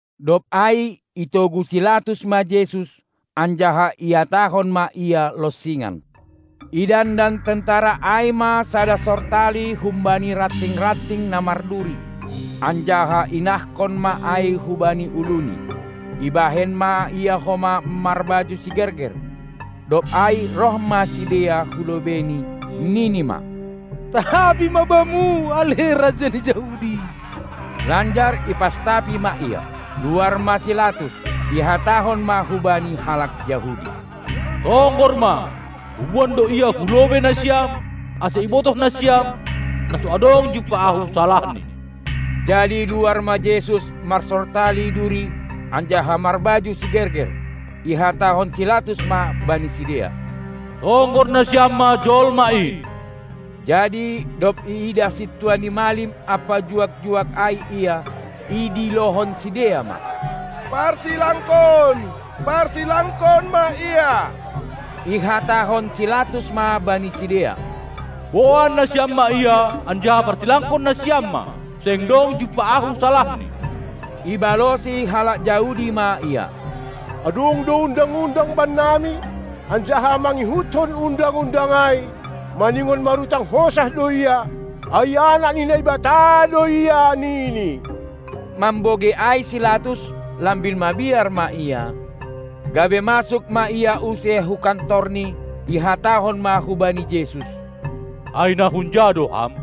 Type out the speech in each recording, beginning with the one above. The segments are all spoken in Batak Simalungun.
Dob ai itogu si Latus ma Jesus, anjaha ihatahon ma Ia lonsingan. Idandan tentara ai ma sada sortali humbani ranting-ranting na marduri, anjaha inahkon ma ai hubani uluNi; ibahen ma Ia homa marbaju sigerger. Dob ai roh ma sidea hu lobeiNi, nini ma: Tabi ma Bamu, ale Raja ni Jahudi! Lanjar ipastapi ma Ia. Luar ma si Latus, ihatahon ma hubani halak Jahudi: Tonggor ma, huboan do Ia hu lobei nasiam, ase ibotoh nasiam, na so adong jumpah ahu salahni. Jadi luar ma Jesus marsortali duri anjaha marbaju sigerger. Ihatahon si Latus ma bani sidea: Tonggor nasiam ma jolma in! Jadi dob iidah sintua ni malim ampa juak-juak ai Ia, idilohon sidea ma: Parsilangkon, parsilangkon ma Ia! Ihatahon si Latus ma bani sidea: Boan nasiam ma Ia anjaha parsilangkon nasiam ma! Seng dong jumpah ahu salahni. Ibalosi halak Jahudi ma Ia: Adong do undang-undang bannami, anjaha mangihutkon undang-undang ai maningon marutang hosah do Ia, ai anak ni Naibata do Ia, nini. Mambogei ai si Latus, lambin mabiar ma ia, gabe masuk ma ia use hu kantorni, ihatahon ma hubani Jesus: Ai na hunja do Ham?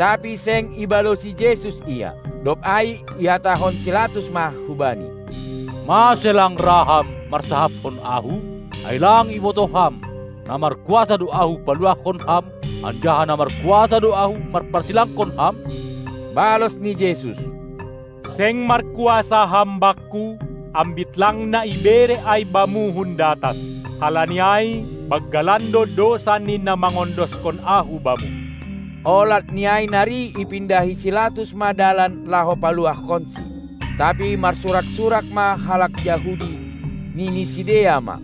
Tapi seng ibalosi Jesus Ia. Dob ai ihatahon si Latus ma hu-Bani: Mase lang ra Ham marsahapkon ahu? Ai lang ibotoh Ham, na markuasa do ahu paluahkon Ham, anjaha na markuasa do ahu mamparsilangkon Ham? Balos ni Jesus: Seng markuasa ham Bakku, ambit lang na ibere ai bamu hun datas. Halani ai banggalan do dousa ni na mangondoskon Ahu bamu. Olat ni ai nari ipindahi si Latus ma dalan laho paluahkonsi. Tapi marsurak-surak ma halak Jahudi, nini sidea ma: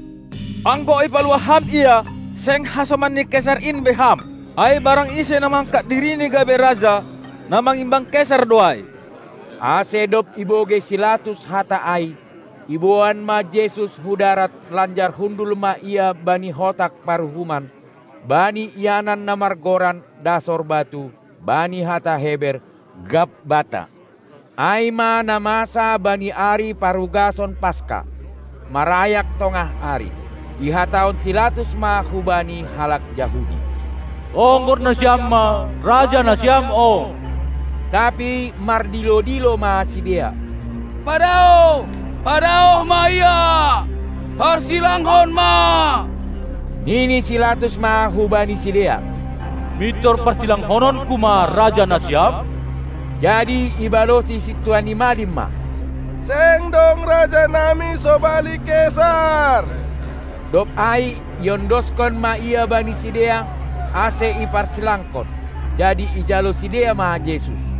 Anggo ipaluah ham Ia, seng hasoman ni Kesar in be ham! Ai barang ise na mangangkat dirini gabe raja, na mangimbang Kesar do ai. Ase dob ibogei si Latus hata ai, iboan ma Jesus hu darat lanjar hundul ma ia bani hotak paruhuman, bani ianan na margoran Dasor batu, bani hata Heber: Gabbatha. Ai ma na masa bani ari parugason Paska, marayak tongah ari. Ihatahon si Latus ma hubani halak Jahudi: Tonggor nasiam ma Raja nasiam on! Tapi mardilo-dilo ma sidea: Padaoh, padaoh ma Ia! Parsilangkon ma! Nini si Latus ma hubani sidea: Mintor parsilangkononku ma Raja nasiam? Jadi ibalosi sintua ni malim ma: Seng dong raja nami sobali Kesar! Dob ai iondoskon ma Ia bani sidea, ase iparsilangkon; jadi ijalo sidea ma Jesus.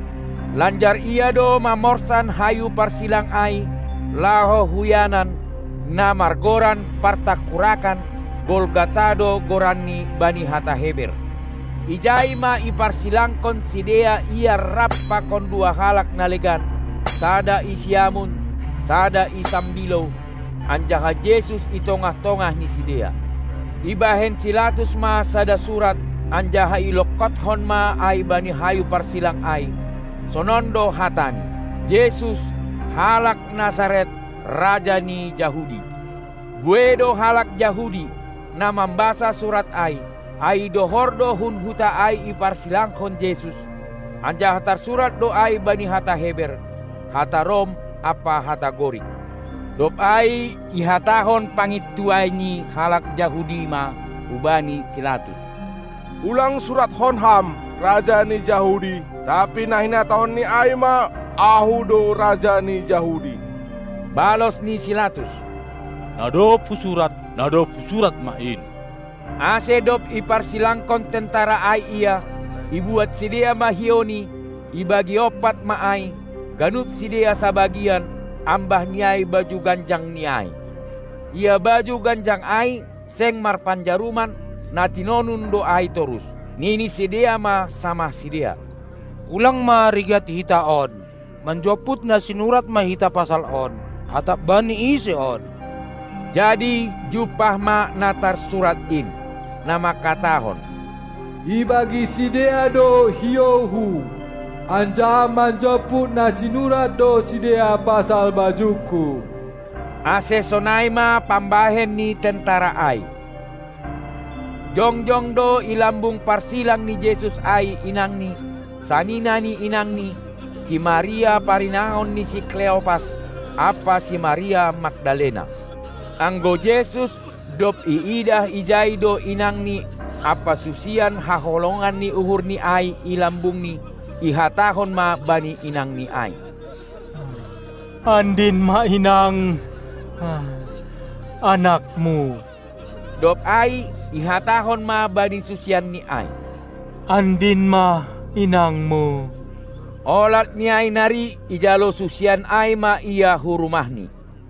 Lanjar Ia do mamorsan hayu parsilang ai, laho hu ianan, na margoran partangkurakan; Golgata do goranni bani hata Heber. Ijai ma iparsilangkon sidea Ia rap pakon dua halak na legan, sada i siamun, sada i sambilou, anjaha Jesus i tongah-tongah ni sidea. Ibahen si Latus ma sada surat, anjaha ilongkothon ma ai bani hayu parsilang ai. Sonon do hatani: Jesus, halak Nazaret, Raja ni Jahudi. Buei do halak Jahudi, na mambasa surat ai, ai dohor do hun huta ai iparsilangkon Jesus, anjaha tarsurat do ai bani hata Heber, hata Rom ampa hata Gorik. Dob ai ihatahon pangintuai ni halak Jahudi ma hubani si Latus: Ulang suratkon ham: Raja ni Jahudi, tapi na hinatahonni ai ma: Ahu do Raja ni Jahudi! Balos ni si Latus: Na dob husurat, na dob husurat ma in! Ase dob iparsilangkon tentara ai Ia, ibuat sidea ma hiouNi, ibagi ompat ma ai, ganup sidea sabagian, ambah ni ai baju ganjangNi ai. Ia baju ganjang ai seng marpanjaruman, na tinonun do ai torus. Nini sidea ma samah sidea: Ulang ma rigat hita on, manjomput na sinurat ma hita pasal on, atap bani ise on. Jadi jumpah ma na tarsurat in, na mangkatahon: Ibagi sidea do hiouHu, anjaha manjomput na sinurat do sidea pasal bajungKu. Ase sonai ma pambahen ni tentara ai. Jongjong do i lambung parsilang ni Jesus ai inangNi, sanina ni inangNi, si Maria parinangon ni si Kleopas, ampa si Maria Magdalena. Anggo Jesus, dob iidah ijai do inangNi ampa susian haholongan ni uhurNi ai i lambungNi, ihatahon ma bani inangNi ai: Andin ma inang, anakmu! Dob ai ihatahon ma bani susianNi ai: Andin ma inangmu! Olat ni ai nari ijalo susian ai ma ia hu rumahni.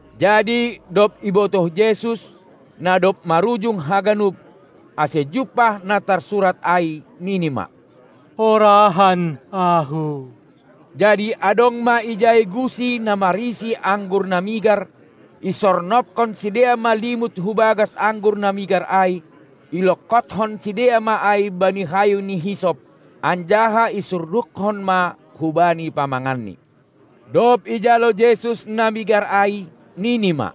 Jadi dob ibotoh Jesus, na dob marujung haganup, ase jumpah na tarsurat ai nini ma: Horahan Ahu! Jadi adong ma ijai gusi na marisi anggur na migar. Isornobkon sidea ma limut hu bagas anggur na migar ai, ilongkothon sidea ma ai bani hayu ni hisop, anjaha isurdukkon ma hubani pamanganNi. Dob ijalo Jesus na migar ai, nini ma: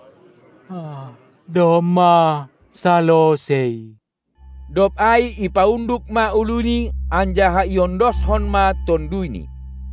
Domma salosei! dob ai ipaunduk ma uluNi anjaha iondoskon ma tonduyNi.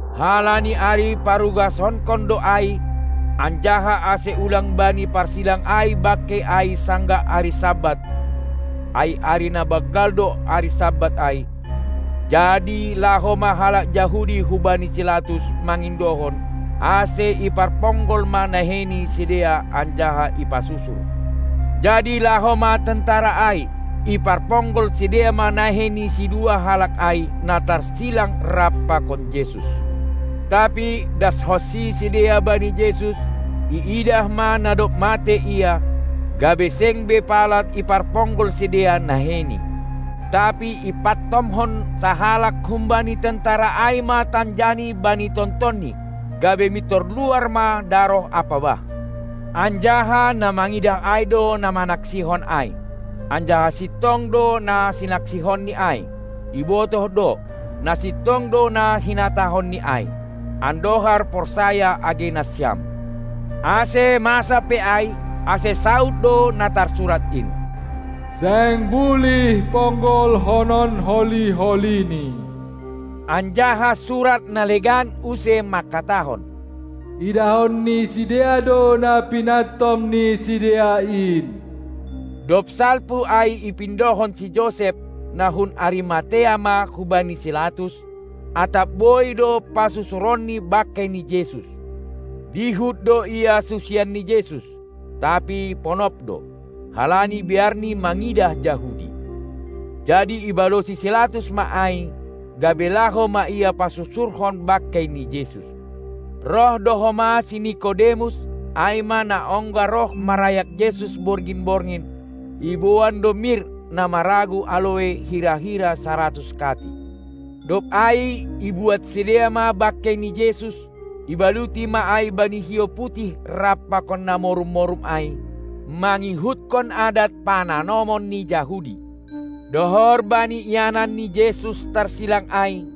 Halani ari parugasonkon do ai, anjaha ase ulang bani parsilang ai bangkei ai sanggah ari Sabat (ai ari na banggal do ari Sabat ai), jadi laho ma halak Jahudi hubani si Latus mangindohon, ase iparponggol ma nahei ni sidea anjaha ipasusur. Jadi laho ma tentara ai, iparponggol sidea ma nahei ni sidua halak ai, na tarsilang rap pakon Jesus. Tapi dashonsi sidea bani Jesus, iidah ma na dob matei Ia, gabe seng be pala iparponggol sidea naheiNi. Tapi ipantomhon sahalak humbani tentara ai ma tanjani bani tontonNi, gabe mintor luar ma daroh ampa bah. Anjaha na mangidah ai do na manaksihon ai, anjaha sintong do na sinaksihonni ai. Ibotoh do, na sintong do na hinatahonNi ai, andohar porsaya age nasiam. Ase masa pe ai, ase saud do na tarsurat in: Seng bulih ponggolhonon holi-holiNi! Anjaha surat na legan use mangkatahon: Idahon ni sidea do na pinantom ni sidea in. Dob salpu ai ipindohon si Josep, na hun Arimatea ma hubani si Latus, atap boi do pasusuronni bangkei ni Jesus. Dihut do ia susian n Jesus, tapi ponop do, halani biarni mangidah Jahudi. Jadi ibalosi si Latus ma ai, gabe laho ma ia pasusurhon bangkei ni Jesus. Roh do homa si Nikodemus, ai ma na ongga roh marayak Jesus borngin-borngin, iboan do mir na maragu aloe hira-hira saratus kati. Dob ai ibuat sidea ma bangkei ni Jesus, ibaluti ma ai bani hiou putih rap pakon na morum-morum ai, mangihuthon adat pananomon ni Jahudi. Dohor bani ianan ni Jesus tarsilang ai,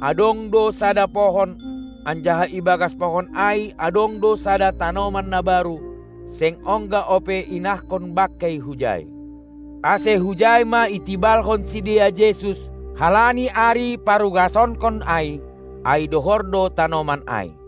adong do sada pohon, anjaha i bagas pohon ai adong do sada tanoman na baru, seng ongga ope inahkon bangkei hujai. Ase hujai ma itibalhon sidea Jesus, halani ari parugasonkon ai, ai dohor do tanoman ai.